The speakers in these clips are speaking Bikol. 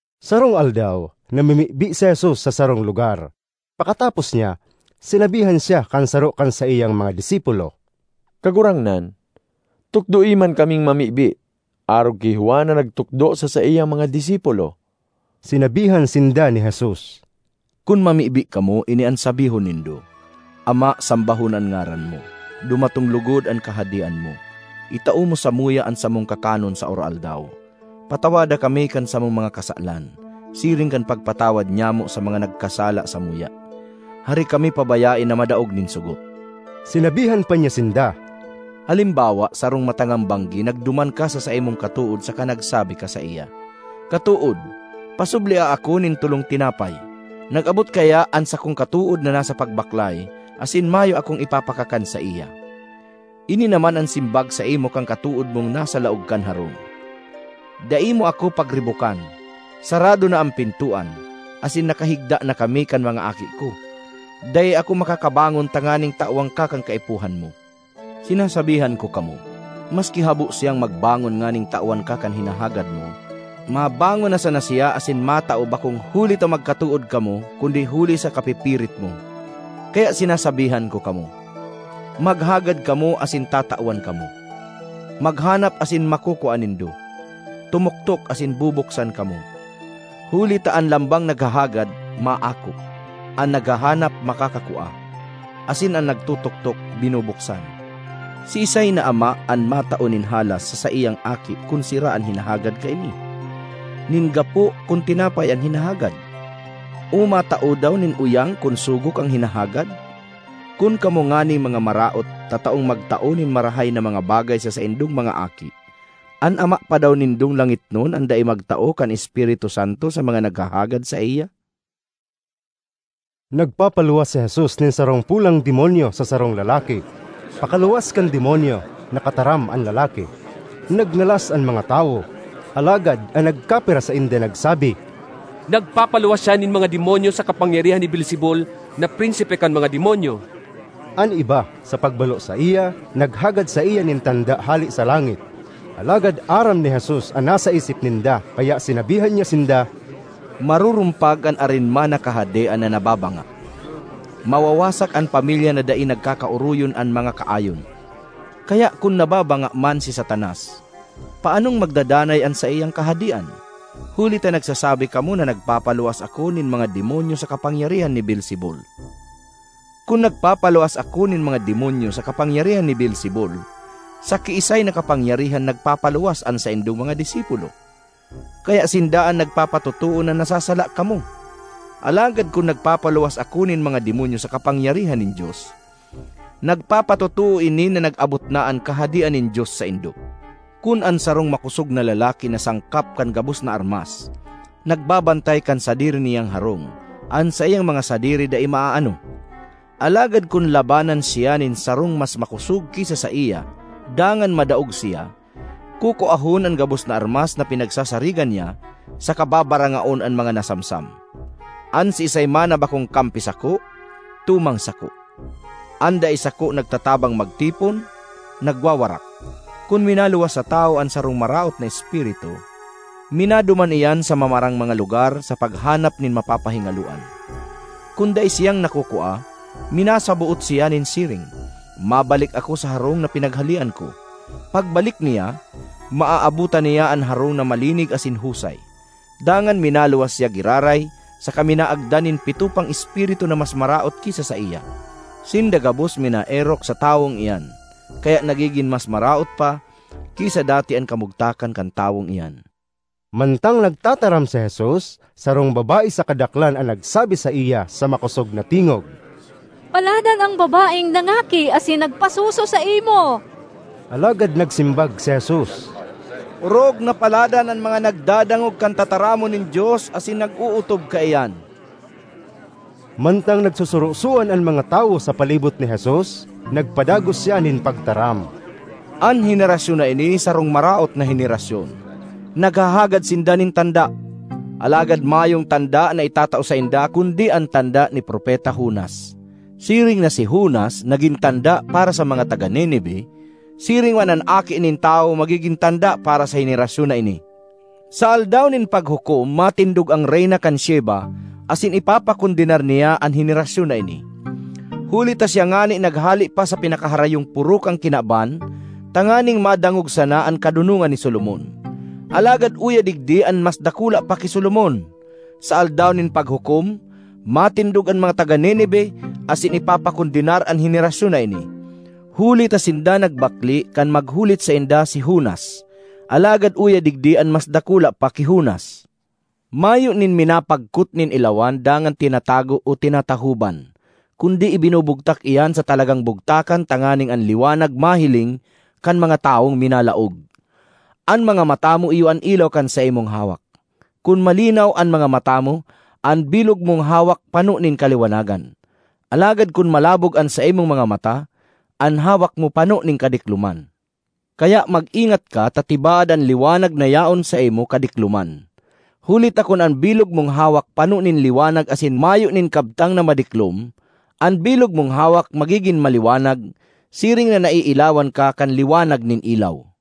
Sarong aldaw, namimibi si Jesus sa sarong lugar. Pakatapos niya, sinabihan siya kan saro kan saiyang mga disipulo, “Kagurangnan, tukdoe man kaming mamibi, arog ki Juan na nagtukdo sa saiyang mga disipulo.” Sinabihan sinda ni Jesus, “Kun mamibi kamo, ini an sabihon nindo: ‘Ama, sambahon an ngaran mo, dumatong logod an Kahadean mo. Itao mo samuya an samong kakanon sa aroaldaw. Patawada kami kan samong mga kasalan, siring kan pagpatawad nyamo sa mga nagkasala samuya. Hare kami pabayae na madaog nin sogot.’” Sinabihan pa niya sinda, “Halimbawa sarong matangang banggi nagduman ka sa saimong katood saka nagsabi ka saiya, ‘Katood, pasublia ako nin tolong tinapay. Nag-abot kaya an sakong katood na nasa pagbaklay asin mayo akong ipapakakan saiya.’ Ini naman an simbag saimo kan katood mong nasa laog kan harong, ‘Dai mo ako pagribokan! Sarado na an pintoan asin nakahigda na kami kan mga aki ko. Dai ako makakabangon tanganing tawan ka kan kaipuhan mo.’ Sinasabihan ko kamo, maski habo siyang magbangon nganing tawan ka kan hinahagad mo, mabangon na sana siya asin matao bakong huli ta magkatood kamo kundi huli sa kapipirit mo. Kaya sinasabihan ko kamo: maghagad kamo asin tatawan kamo; maghanap asin makukua nindo; tumuktok asin bubuksan kamo. Huli ta an lambang naghahagad, maako; an naghahanap, makakakua; asin an nagtutuktok, binubuksan. Siisay na ama an matao nin halas sa saiyang aki kun sira an hinahagad kaini? (nin gapo kun tinapay an hinahagad?) O matao daw nin uyang kun sugok an hinahagad? Kun kamo nganing mga maraot, tataong magtao nin marahay na mga bagay sa saindong mga aki, an Ama pa daw nindong langitnon an dai magtao kan Espiritu Santo sa mga naghahagad saiya?” Nagpapaluwas si Jesus nin sarong polang demonyo sa sarong lalaki; pakaluwas kan demonyo, nakataram an lalaki. Nagngalas an mga tawo, alagad an nagkapira sainda nagsabi, “Nagpapaluwas siya nin mga demonyo sa kapangyarihan ni Beelzebul, na prinsipe kan mga demonyo.” An iba, sa pagbalo saiya, naghagad saiya nin tanda hale sa langit. Alagad aram ni Jesus an nasa isip ninda kaya sinabihan niya sinda, “Marurumpag an arin man na kahadean na nababanga; mawawasak an pamilya na dai nagkakaoroyon an mga kaayon. Kaya kun nababanga man si Satanas, paanong magdadanay an saiyang kahadean? Huli ta nagsasabi kamo na nagpapaluwas ako nin mga demonyo sa kapangyarihan ni Beelzebul. Kun nagpapaluwas ako nin mga demonyo sa kapangyarihan ni Beelzebul, sa kiisay na kapangyarihan nagpapaluwas an saindong mga disipulo? Kaya sinda an nagpapatotoo na nasasala kamo! Alagad kun nagpapaluwas ako nin mga demonyo sa kapangyarihan nin Dios, nagpapatotoo ini na nag-abot na an Kahadean nin Dios saindo. ”Kun an sarong makosog na lalaki na sangkap kan gabos na armas, nagbabantay kan sadiri niyang harong, an saiyang mga sadiri dai maaano. Alagad kun labanan siya nin sarong mas makosog ki sa saiya dangan madaog siya, kukuahon an gabos na armas na pinagsasarigan niya saka babarangaon an mga nasamsam. ”An siisay man na bakong kampi sako, tumang sako; an dai sako nagtatabang magtipon, nagwawarak. ”Kun minaluwas sa tawo an sarong maraot na espiritu, minaduman iyan sa mamarang mga lugar sa paghanap nin mapapahingaloan. Kun dai siyang nakukua, minasaboot siya nin siring, ‘Mabalik ako sa harong na pinaghalean ko.’ Pagbalik niya, maaabotan niya an harong na malinig asin husay. Dangan minaluwas siya giraray saka minaagda nin pito pang espiritu na mas maraot ki sa saiya; sinda gabos minaerok sa tawong iyan. Kaya nagigin mas maraot pa ki sa dati an kamugtakan kan tawong iyan.” Mantang nagtataram si Jesus, sarong babae sa kadaklan an nagsabi saiya sa makosog na tingog, “Paladan an babaeng nangaki asin nagpasuso saimo!” Alagad nagsimbag si Jesus, “Orog na paladan an mga nagdadangog kan tataramon nin Dios asin nag-ootob kaiyan!” Mantang nagsusurosoan an mga tawo sa palibot ni Jesus, nagpadagos siya nin pagtaram, “An henerasyon na ini sarong maraot na henerasyon! Naghahagad sinda nin tanda, alagad mayong tanda na itatao sainda kundi an tanda ni Propeta Jonas. Siring na si Jonas nagin tanda para sa mga taga Nineve, siring man an Aki nin Tawo magigin tanda para sa henerasyon na ini. Sa Aldaw nin Paghukom matindog an Reyna kan Sheba asin ipapakondenar niya an henerasyon na ini, huli ta siya ngani naghale pa sa pinakaharayong poro kan kinaban tanganing madangog sana an kadonongan ni Solomon. Alagad uya digdi an mas dakula pa ki Solomon! Sa Aldaw nin Paghukom matindog an mga taga Nineve asin ipapakondenar an henerasyon na ini, huli ta sinda nagbakle kan maghulit sainda si Jonas. Alagad uya digdi an mas dakula pa ki Jonas! ”Mayo nin minapagkot nin ilawan dangan tinatago o tinatahoban, kundi ibinubugtak iyan sa talagang bugtakan tanganing an liwanag mahiling kan mga tawong minalaog. An mga mata mo iyo an ilaw kan saimong hawak. Kun malinaw an mga mata mo, an bilog mong hawak pano nin kaliwanagan; alagad kun malabog an saimong mga mata, an hawak mo pano nin kadikloman. Kaya mag-ingat ka ta tibaad an liwanag na yaon saimo kadikloman. Huli ta kun an bilog mong hawak pano nin liwanag asin mayo nin kabtang na madiklom, an bilog mong hawak magigin maliwanag siring na naiilawan ka kan liwanag nin ilaw.”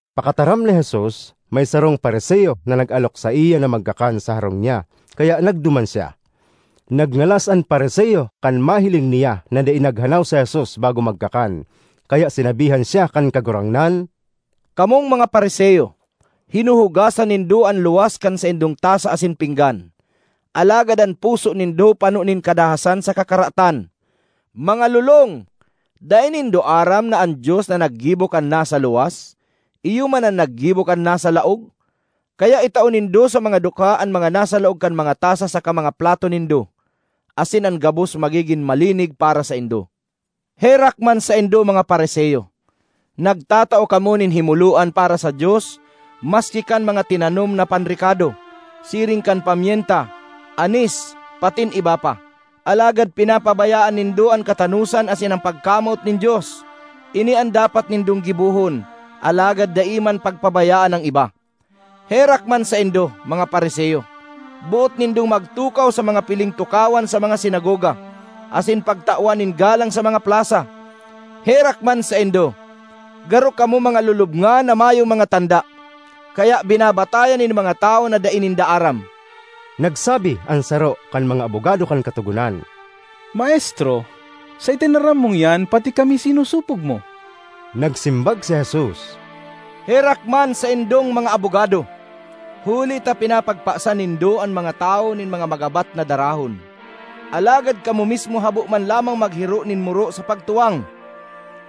Pakataram ni Jesus, may sarong Fariseo na nag-alok saiya na magkakan sa harong niya, kaya nagduman siya. Nagngalas an Fariseo kan mahiling niya na dai naghanaw si Jesus bago magkakan. Kaya sinabihan siya kan Kagurangnan, “Kamong mga Fariseo, hinuhugasan nindo an luwas kan saindong tasa asin pinggan, alagad an puso nindo pano nin kadahasan saka karatan. Mga lolong! Dai nindo aram na an Dios na naggibo kan nasa luwas, iyo man an naggibo kan nasa laog? Kaya itao nindo sa mga dukha an mga nasa laog kan mga tasa saka mga plato nindo, asin an gabos magigin malinig para saindo. ”Herak man saindo, mga Fariseo! Nagtatao kamo nin himoloan para sa Dios maski kan mga tinanom na panrekado, siring kan pamyenta, anis patin iba pa, alagad pinapabayaan nindo an katanosan asin an pagkamoot nin Dios. Ini an dapat nindong gibohon, alagad dai man pagpabayaan an iba. ”Herak man saindo, mga Fariseo! Boot nindong magtukaw sa mga piling tukawan sa mga sinagoga, asin pagtawan nin galang sa mga plasa. Herak man saindo! Garo kamo mga lulubngan na mayong mga tanda, kaya binabatayan nin mga tawo na dai ninda aram.” Nagsabi an saro kan mga abogado kan Katogonan, “Maestro, sa itinaram mong iyan, pati kami sinosopog mo!” Nagsimbag si Jesus, “Herak man saindong mga abogado! Huli ta pinapagpasan nindo an mga tawo nin mga magabat na darahon, alagad kamo mismo habo man lamang maghiro nin muro sa pagtuwang.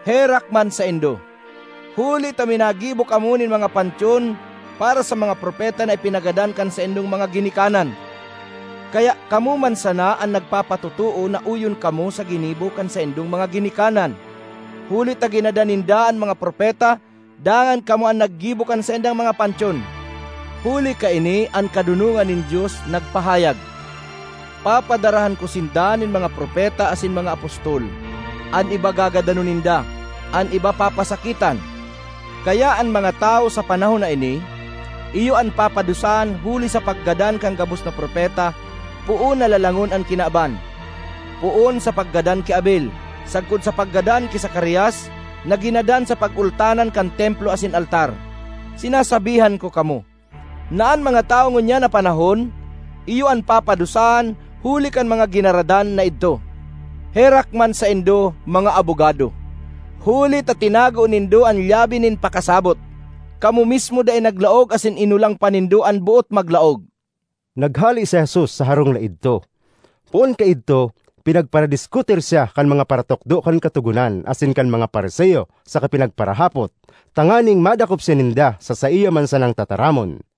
Herak man saindo! Huli ta minagibo kamo nin mga pantyon para sa mga propeta na ipinagadan kan saindong mga ginikanan. Kaya kamo man sana an nagpapatotoo na oyon kamo sa ginibo kan saindong mga ginikanan; huli ta ginadan ninda an mga propeta dangan kamo an naggibo kan saindang mga pantyon. Huli kaini an Kadonongan nin Dios nagpahayag, ‘Papadarahan ko sinda nin mga propeta asin mga apostol; an iba gagadanon ninda, an iba papasakitan.’ Kaya an mga tawo sa panahon na ini iyo an papadusahan huli sa paggadan kan gabos na propeta poon na lalangon an kinaban, poon sa paggadan ki Abel sagkod sa paggadan ki Zacarias na ginadan sa pagultanan kan Templo asin altar. Sinasabihan ko kamo, na an mga tawo ngunyan na panahon iyo an papadusahan huli kan mga ginaradan na idto. ”Herak man saindo, mga abogado! Huli ta tinago nindo an lyabe nin pakasabot; kamo mismo dai naglaog asin inolang pa nindo an boot maglaog!” Naghale si Jesus sa harong na idto. Poon kaidto pinagparadiskutir siya kan mga paratukdo kan Katogonan asin kan mga Fariseo saka pinagparahapot, tanganing madakop siya ninda sa saiya man sanang tataramon.